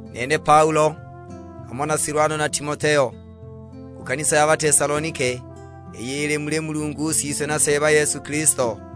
Nene Paulo, hamo na Silwano na Timoteo; ku kanisa ya Batesalonike, iyo ili muli Mulungu Siswe na Seeba Yesu Kilisto.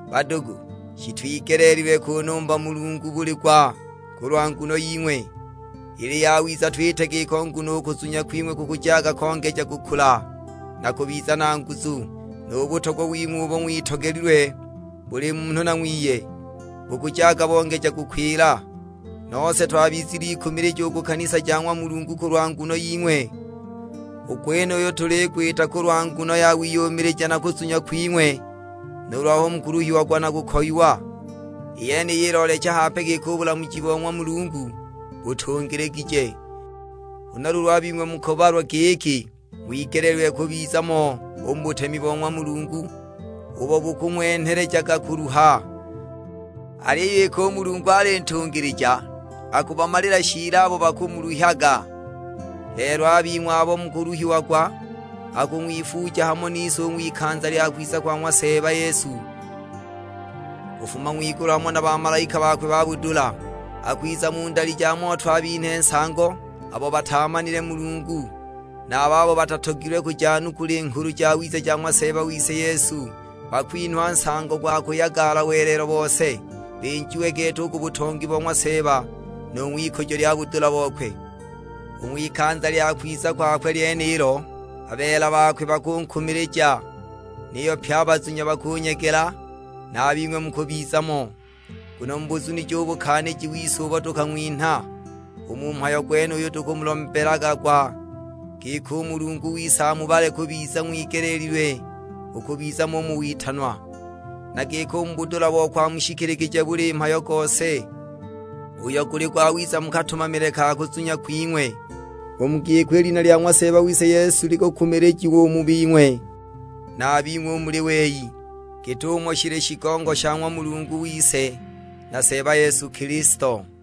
Badugu, shitwigeleelilwe kunumba Mulungu buli gwa kulwa nguno ying'we. Ili yawiza twite giko nguno u kuzunya kwing'we kukujaga kongeja kukula na kubiza na nguzu; nu butogwa wing'we umo ng'witogelilwe buli munhu na ng'wiye bukujaga bongeja kukwila. Nose twabizilikumilija u ku kanisa ja ng'wa Mulungu kulwa nguno ying'we. U gwenuyo tuligwita kulwa nguno ya wiyumilija na kuzunya kwing'we nuulu aho mukuluhiagwa na kukoyiwa. I yeniyi iloolecha hape giki u bulamuji bo ng'wa Mulungu butungiligije. Huna luulu a bing'we mukubalwa giki ng'wigeleelilwe kubiza mo u mu butemi bo ng'wa Mulungu ubo bukung'wenhelejaga kuluha. Aliyo iki u Mulungu ali ntungilija, akubamalila shiili abo bakumuluhyaga. Lelo a bing'we abo mukuluhiagwa, akung'wifuuja hamo nise u ng'wikanza lya kwiza kwa ng'wa Seeba Yesu, kufuma ng'wigulu hamo na bamalaika bakwe ba budula. Akwiza mu ndali ja moto abinhe nsango abo bataamanile Mulungu, na a babo batatogilwe kujanukula i Nghulu Jawiza ja ng'wa Seeba wise Yesu. Bakwinhwa nsango gwa kuyagala welelo bose, binjiwe gete u ku butongi bo ng'wa Seeba, nu ng'wikujo lya budula bokwe. U ng'wikanza lya kwiza kwakwe lyenilo, a beela bakwe bakunkumilija, niyo pye a bazunya bakunyegela; na a bing'we mukubiza mo, nguno mubuzunije u bukaaniji wise ubo tukang'winha. U mu mhayo gwenuyu tukumulombelaga gwa, giki u Mulungu wise amubale kubiza ng'wigeleelilwe u kubiza mo u mu witanwa, na giki u mu budula bokwe amushikiligije buli mhayo gose, uyo guli gwawiza mu katumamile ka kuzunya kwing'we. U mu giko i lina lya ng'wa Seeba wise Yesu likukumilijiwa u mu bing'we, na a bing'we u muli wei, git'umo shili shigongo sha ng'wa Mulungu wise na Seeba Yesu Kilisto.